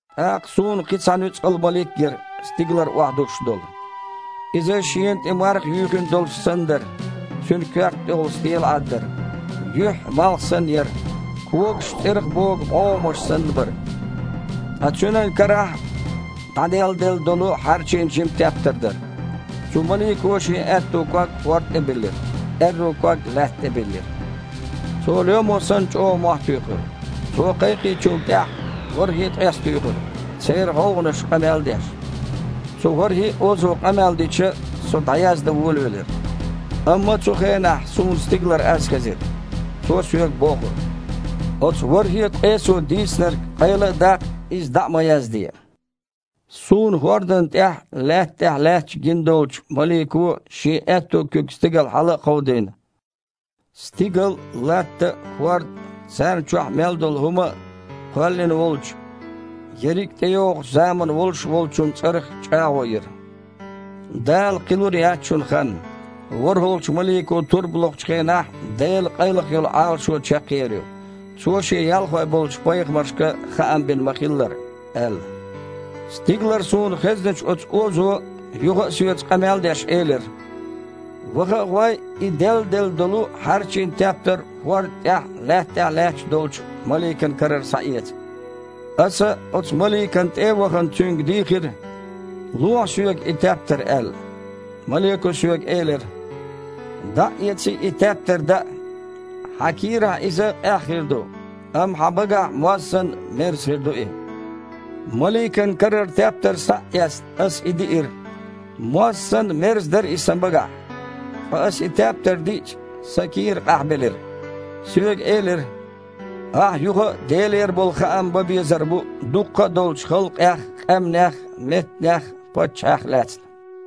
ТІаккха суна кхин а цхьа нуьцкъала малик гира, стигалара охьадуссуш долу. Иза шена тІе марха юьйхина долуш санна дара, цуьнан коьрта тІехула стелаІад а дара. Юьхь, малх санна, яра. Когаш, цІерах богу бІогІамаш санна, бара. Ткъа цуьнан карахь дІаделладелла долу хьарчийна жима тептар дара. Цу малико шен аьтту ког хІорда тІе биллира, аьрру ког лаьтта тІе биллира. Цо, лоьмо санна, чІогІа мохь туьйхира. Цо кхайкхинчул тІаьхьа, ворхІе а ткъес туьйхира, церан гІовгІанаша къамел а деш. Цу ворхІе а озо къамел дича, со дІаяздан волавелира, амма цу хенахь суна стигалара аз хезира. Цо соьга бохура: «Оцу ворхІе а ткъесо дийцинарг къайла а даккха, иза дІа а ма язде». Суна хІордана тІехь а, лаьтта тІехь а лаьтташ гина долчу малико, шен аьтту куьг стигала хьала а кховдийна, стигал а, латта а, хІорд а, царна чохь мел долу хІума а кхоьллина волчу, ерриг а тІейогІучу заманна волуш Волчун цІарах чІагІо йира: «Дала кхин лур яц шуна хан. ВорхІалгІачу малико турба локхучу хенахь Делан къайлаха йолу Іалашо чекхъер ю, Цо Шен ялхой болчу пайхамаршка хаам бина ма-хиллара», – аьлла. Стигалара суна хезначу цу озо, юха а соьца къамел а деш, элира: «Ваха а гІой, и делладелла долу хьарчийна тептар хІорда тІехь а, лаьтта тІехь а лаьтташ долчу маликан карара схьаэца». Аса, оцу маликана тІе а вахана, цуьнга дийхира: «Лохьа соьга и тептар», – аьлла. Малико соьга элира: «ДІа а эций, и тептар даа. Хьан кийрахь иза къаьхьа хир ду, амма хьан багахь, моз санна, мерза хир ду и». Маликан карара тептар схьа а эцна, аса и диира. Моз санна, мерза дара иза сан багахь. Ткъа аса и тептар диъча, сан кийра къахьбелира. Соьга элира: «Ахьа юха а Делера болу хаам бан безар бу дуккха а долчу халкъех а, къаьмнех а, меттанех а, паччахьех а лаьцна».